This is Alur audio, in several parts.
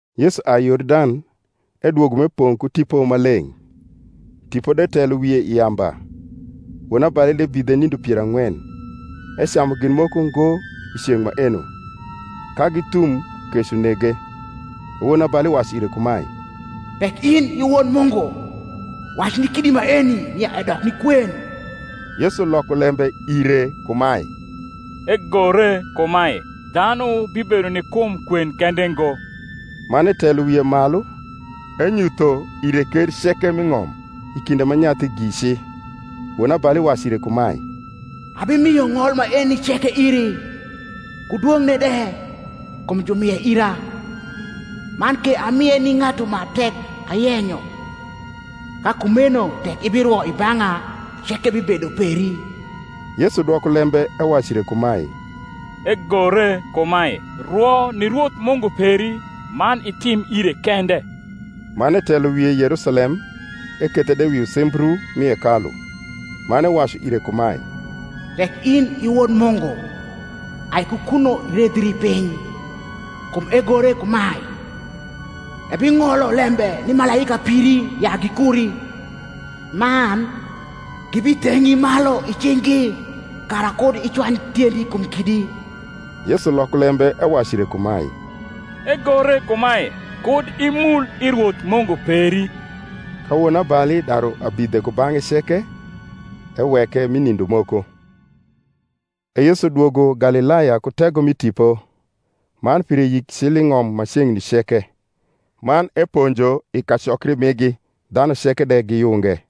Yesu ai Yordan, edwogo m’epong’ ku Tipo Maleng’, Tipo de telo wie i yamba wonabali de bidhe nindo pier ang’wen. Ecamu gin moko ngo i ceng’ maeno: ka githum, kec unege. E wonabali wacu ire kumae, Tek in i Wod Mungu, wac ni kidi maeni nia edok ni kwen. Yesu loko lembe ire kumae, Egore kumae, Dhanu bibedo ni kum kwen kende ngo. Man etelo wie malu, enyutho ire ker ceke m’i ng’om i kinde ma nyathigi ci. Wonabali wacu ire kumae, Abimio ng’ol maeni ceke iri, ku dwong’ne de: kum jumie ira; man ke amie ni ng’atu ma tek ayenyo. Ka kumeno tek ibirwo i bang’a, ceke bibedo peri. Yesu dwoko lembe ewacu ire kumae, Egore kumae, Rwo ni Rwoth Mungu peri, man itim ire kende. Man etelo wie Yerusalem ekethe de wi usimbru mi hekalu, man ewacu ire kumae, Tek in i Wod Mungu, ai ku kuno iredhri piny: kum egore kumae, Ebing’olo lembe ni malaika piri ya gikuri: man, Gibitheng’i malu i cing’gi, Kara kud icwany tiendi kum kidi. Yesu loko lembe ewacu ire kumae, Egore kumae, Kud imul i Rwoth Mungu peri. Ka wonabali daru abidhe kubang’e ceke, eweke mi nindo moko. E Yesu dwogo Galilaya ku tego mi Tipo: man pire yik cil i ng’om ma ceng’ni ceke. Man eponjo i kacokri migi, dhanu ceke de giyunge.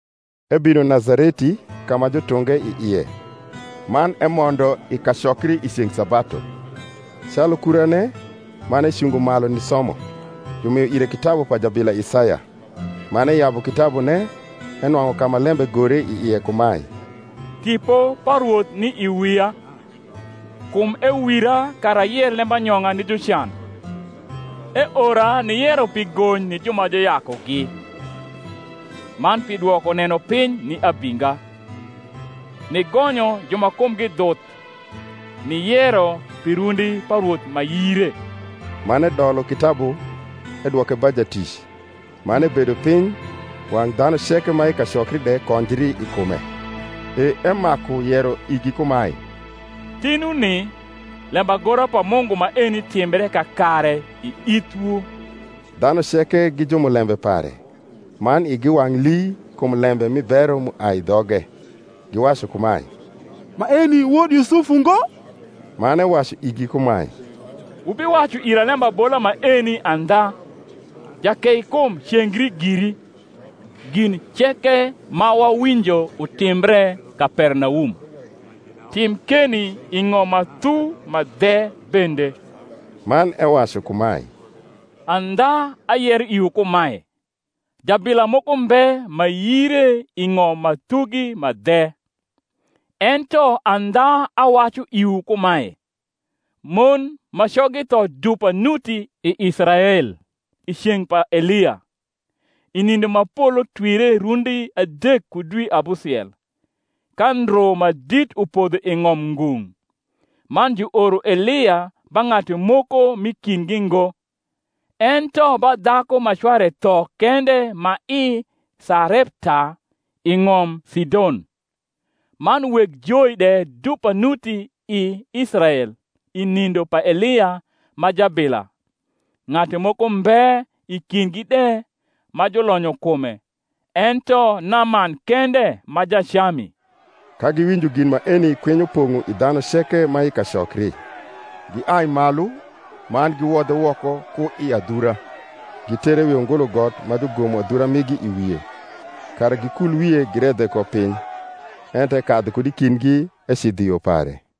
Ebino Nazareti, ka ma jutunge i ie: man emondo i kacokri i ceng’ sabatu, calu kurane, man ecungo malu nisomo. Jumio ire kitabu pa jabila Isaya. Man eyabu kitabune, enwang’u ka ma lembe gore i ie kumae, Tipo pa Rwoth ni i wia, Kum ewira kara ayer lembanyong’a ni jucan: Eora niyero pi gony ni ju ma juyakugi, Man pi dwoko nenopiny ni abinga, Nigonyo ju ma kumgi dhuth, Niyero pi rundi pa Rwoth ma yire. Man edolo kitabu, edwoke ba jatic, man ebedo piny: wang’ dhanu ceke ma i kacokri de konjri i kume. E emaku yero igi kumae, Tinuni lembagora pa Mungu maeni timbre kakare i ithwu. Dhanu ceke gi jumulembe pare, man igi wang’ lii kum lembe mi bero m’uai i dhoge: giwacu kumae, Maeni wod Yusuf ungo? Man ewacu igi kumae, Wubiwacu ira lembabola maeni andha, Jakeikum cengri giri: gin ceke ma wawinjo utimbre Kapernaum, tim keni i ng’om ma thu ma dhe bende. Man ewacu kumae, Andha ayero iwu kumae, Jabila moko mbe ma yire i ng’om ma thugi ma dhe. Ento andha awacu iwu kumae, Mon ma coggi tho dupa nuti i Israel i ceng’ pa Elia, i nindo ma polo twire rundi adek ku dwi abusiel, ka ndru ma dit upodho i ng’om ngung’; man juoro Elia ba ng’atu moko m’i kindgi ngo, ento ba dhaku ma cware tho kende ma i Sarepta, i ng’om Sidon. Man weg joi de dupa nuti i Israel i nindo pa Elia ma jabila; ng’atu moko mbe i kindgi de ma julonyo kume, ento Naman kende ma Jacami. Ka giwinjo gin maeni kwinyo pong’o i dhanu ceke ma i kacokri; giai malu, man giwodhe woko ku i adhura, gitere wi ungulu got ma jugomo adhura migi I wie, kara gikul wie giredhe ko piny. Ento ekadhu kud i kindgi ecidho i yo pare.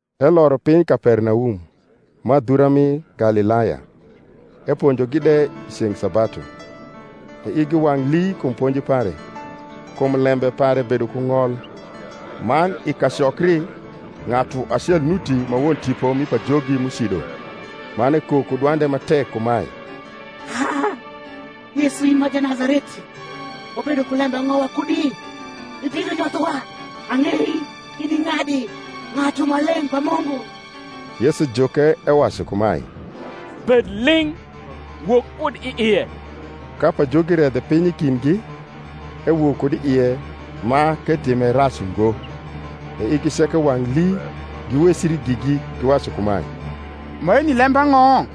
Eloro piny Kapernaum, ma adhura mi Galilaya. Eponjogi de i ceng’ sabatu: e igi wang’ lii kum ponji pare; kum lembe pare bedo ku ng’ol. Man i kacokri ng’atu acel nuti ma won tipo mi pajogi m’ucido; man ekok ku dwande ma tek kumae, Ha! Yesu in ma Janazareti, wabedo ku lembang’o wakudi? ibino nyothowa? Ang’ei in i ng’adi, Ng’atu Maleng’ pa Mungu. Yesu juke ewacu kumae, Bed ling’, wok kud i ie. Ka pajogi redhe piny i kindgi, ewok kud i ie ma k’etime rac ungo. E igi ceke wang’ lii, giwecri gigi, giwacu kumae, Maeni lembang’o?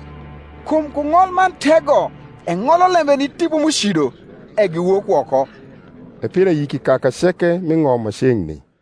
kum ku ng’ol man tego eng’olo lembe ni tipo m’ucido, e giwok woko. E pire yik i kaka ceke m’i ng’om ma ceng’ni.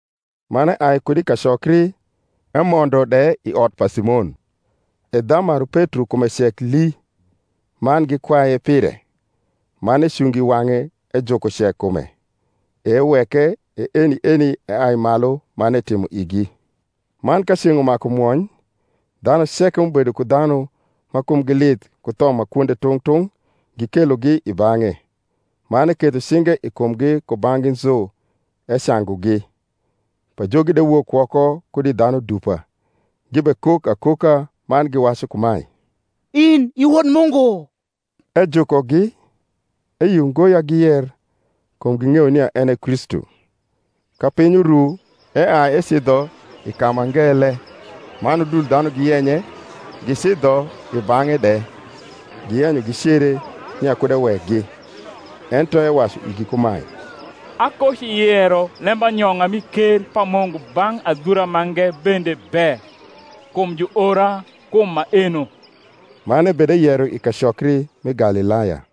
Man eai kud i kacokri, emondo de i ot pa Simon. E dhamaru Petro kume cek lii; man gikwaye pire. Man ecungo i wang’e ejuko cekkume; e eweke: e eni eni eai malu man etimo igi. Man ka ceng’ umaku mwony, dhanu ceke m’ubedo ku dhanu ma kumgi lith ku tho ma kwonde tung’ tung’ gikelogi i bang’e; man eketho cinge i kumgi kubang’gi nzu, ecangugi. Pajogi de wok woko kud i dhanu dupa, gibekok akoka, man giwacu kumae, In i Wod Mungu. Ejukogi, eyio ngo ya giyer, kum ging’eyo nia en e Kristu. Ka piny uru, eai ecidho i ka ma ngele: man udul dhanu giyenye, gicidho i bang’e de, giyenyo gicere, nia kud ewekgi. Ento ewacu igi kumae, Akociyero lembanyong’a mi ker pa Mungu bang’ adhura mange bende be: kum juora kum maeno. Man ebedeyero i kacokri mi Galilaya.